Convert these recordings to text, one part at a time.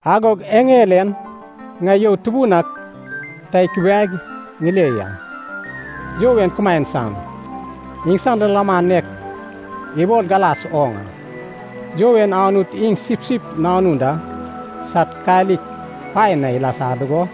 Agog eŋel en ŋai you tubun ak ta ikubiaig ŋile ya. You en kumaen san, iŋsan lilaman nek ibol galas oŋ a. You en Anut iŋ Sipsip Nanun da sad kalik paen na ilasa dugo,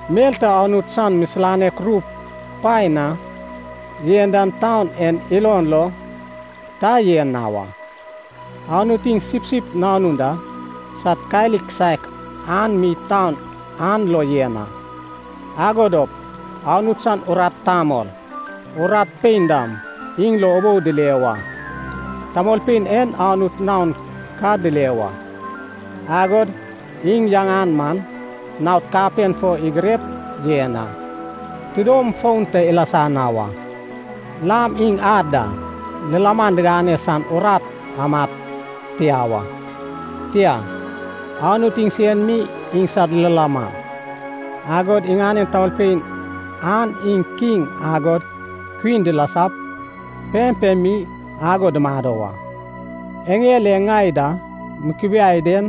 Mel ta Anut san misilanek ru paen na yen dan taun en ilon lo ta yen na wa. Anut iŋ Sipsip Nanun da sad kalik kisaek an mi taun an lo yen a. Ago dop Anut san urat tamol, urat pein dam iŋ lo ubou dile wa. Tamolpein en Anut naon ka dile wa, agod iŋ yaŋan man naod kapen fo igirep yen a. Tidom fon ta ilasa na wa. Lam iŋ ad da lilaman digane san urat amad tia wa. Tia, Anut iŋsen mi iŋsad lilaman. Agod iŋanen tamolpein an iŋ kiŋ agod kwin dilasap pempem mi ago dumado wa. Eŋel e ŋai da mukubiai den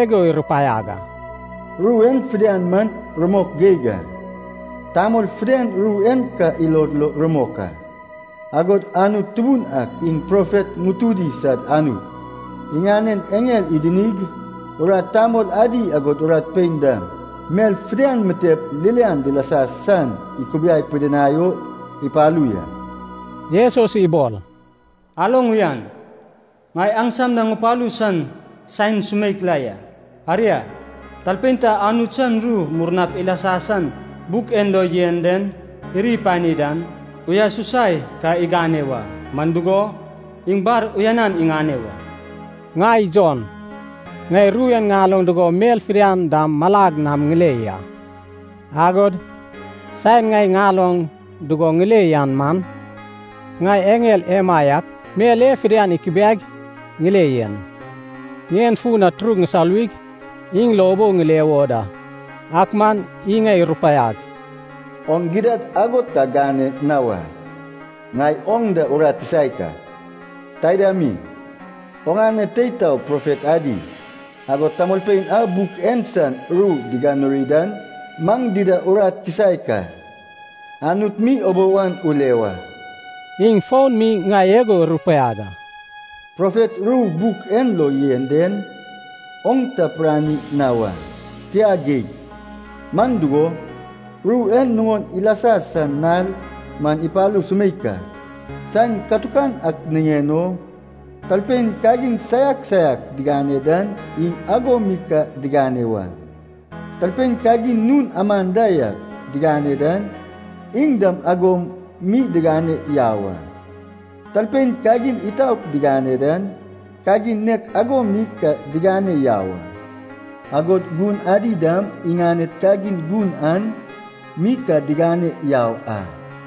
igo irupaiag a, “Ru en fidian man rumok geig a, tamol fidian ru en ka ilod lo rumok a. Agod Anut Tubun ak iŋ profet ŋutudi sad Anut, iŋanen eŋel idinig urat tamol adi agod urat pein dam, mel fidian mitep ririan dilasa san ikubiai pidinai o ipalu ya.” Jesus ibol, “Aloŋ uyan. Ŋai aŋsam na ŋupalu san saen sumeik la ya. Aria, talpein ta Anut san ru murnap ilasa san buk en lo yen den iri ipani dan, uyasusai ka igane wa, man dugo, iŋ bar uyanan iŋane wa.” Ŋai Jon, ŋai ru en ŋaloŋ dugo mel fidian dam malag nam ŋile ya. Agod saen ŋai ŋaloŋ dugo ŋile yan man, ŋai eŋel emaiak mel e fidian ikubiag ŋile yen, ŋien fun na turug ŋusoluwig iŋ lo ubou ŋile wo da. Ak man iŋ ŋai irupaiag, “Oŋ gidad ago ta gane na wa. Ŋai oŋ da urat kisaek a. Taida mi, oŋane tei tao profet adi, agod tamolpein a buk en san ru diganuri dan maŋ dida urat kisaek a. Anut mi ubou an ule wa!” Iŋ fon mi ŋai igo irupaiag a. “Profet ru buk en lo yen den, oŋ ta pirani na wa. Tia geig, man dugo, ru en nuŋon ilasa san nal man ipalu sumeik a. Saen katukan ak niŋen o, talpein kagin saiak saiak digane dan iŋ ago mi ka digane wa. Talpein kagin nun aman da yak digane dan, iŋ dam ago mi digane yau a. Talpein kagin itaot digane dan, kagin nek ago mi ka digane yau a. Agod gun adi dam iŋaned kagin gun an mi ka digane yau a.”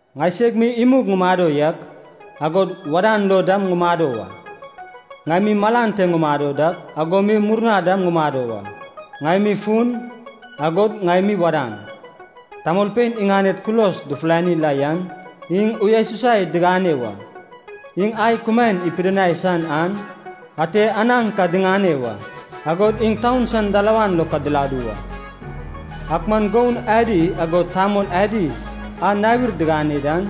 Ŋaiseg mi imug ŋumado yak, agod wadan lo dam ŋumado wa. Ŋai mi malan te ŋumado dak, ago mi murna dam ŋumado wa. Ŋai mi fun, agod ŋai mi wadan. “Tamolpein iŋaned kulos dufulani la yan, iŋ uyasusai digane wa. Iŋ ai kumaen ipidinai san an ate anaŋ ka diŋane wa. Agod iŋ taun san dalawan lo ka diladu wa. Ak man goun adi agod tamol adi a nawir digane dan,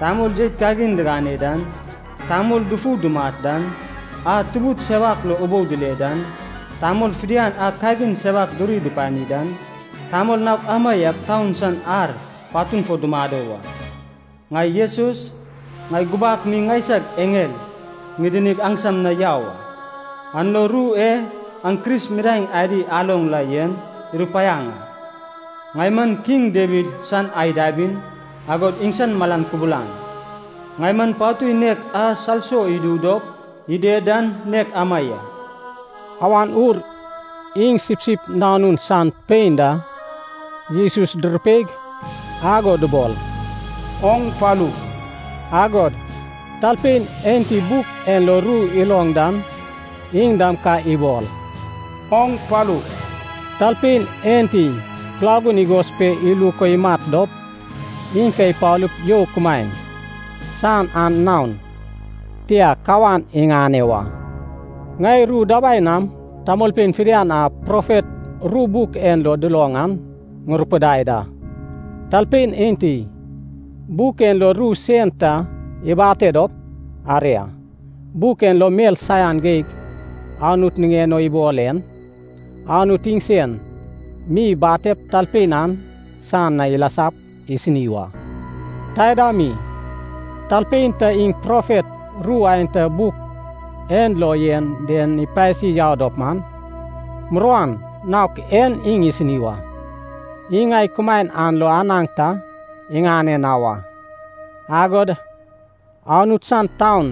tamol jeit kagin digane dan, tamol dufu dumat dan, a tubud sewak lo ubou dile dan, tamol fidian a kagin sewak duri dupani dan, tamol naok amaiak taun san ar patun fo dumado wa. “Ŋai Jesus, ŋai gubak mi ŋaisag eŋel ŋidinig aŋsam na yau a, an lo ru e aŋ Kris midaeŋ adi aloŋ la yen irupaiaŋ a. Ŋai man kiŋ Dawid san ai dabin, agod iŋsan malan kubulan. Ŋai man patui nek a salso idu dop ided dan nek ama ya.” Awan Ur iŋ Sipsip Nanun san pein da Jesus durupeig ago dubol, “Oŋ palu.” Agod talpein enti buk en lo ru iloŋ dan iŋ dam ka ibol, “Oŋ palu.” Talpein enti kulagun igos pe iluk o imat dop, iŋ ka ipalup you kumaen san an naon tia kawan iŋane wa. Ŋai ru dabai nam tamolpein fidian a profet ru buk en lo duloŋ an ŋurupidai da. Talpein enti buk en lo ru sen ta ibate dop, aria, buk en lo mel saian geig Anut niŋen o ibol en, Anut iŋsen mi ibatep talpein an san na ilasap isini wa. Taida mi, talpein ta iŋ profet ru aenta buk en lo yen den ipasi yau dop man, muruan naok en iŋ isini wa. Iŋ ai kumaen an lo anaŋ ta iŋane na wa. Agod Anut san taun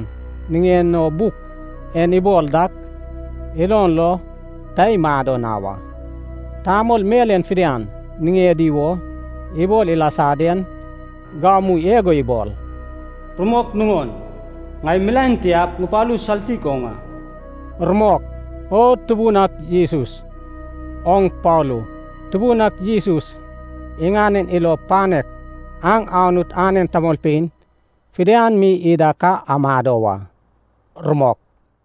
niŋen o buk en ibol dak, ilon lo ta imado na wa. Tamol mel en fidian niŋedi wo ibol ilasa den, gamu igo ibol, “Rumok nuŋon, ŋai milaen tiap ŋupalu saltik oŋ a.” Rumok. O Tubun ak Jesus, oŋ palu! Tubun ak Jesus iŋanen ilo panek aŋ Anut anen tamolpein fidian mi ida ka amado wa. Rumok.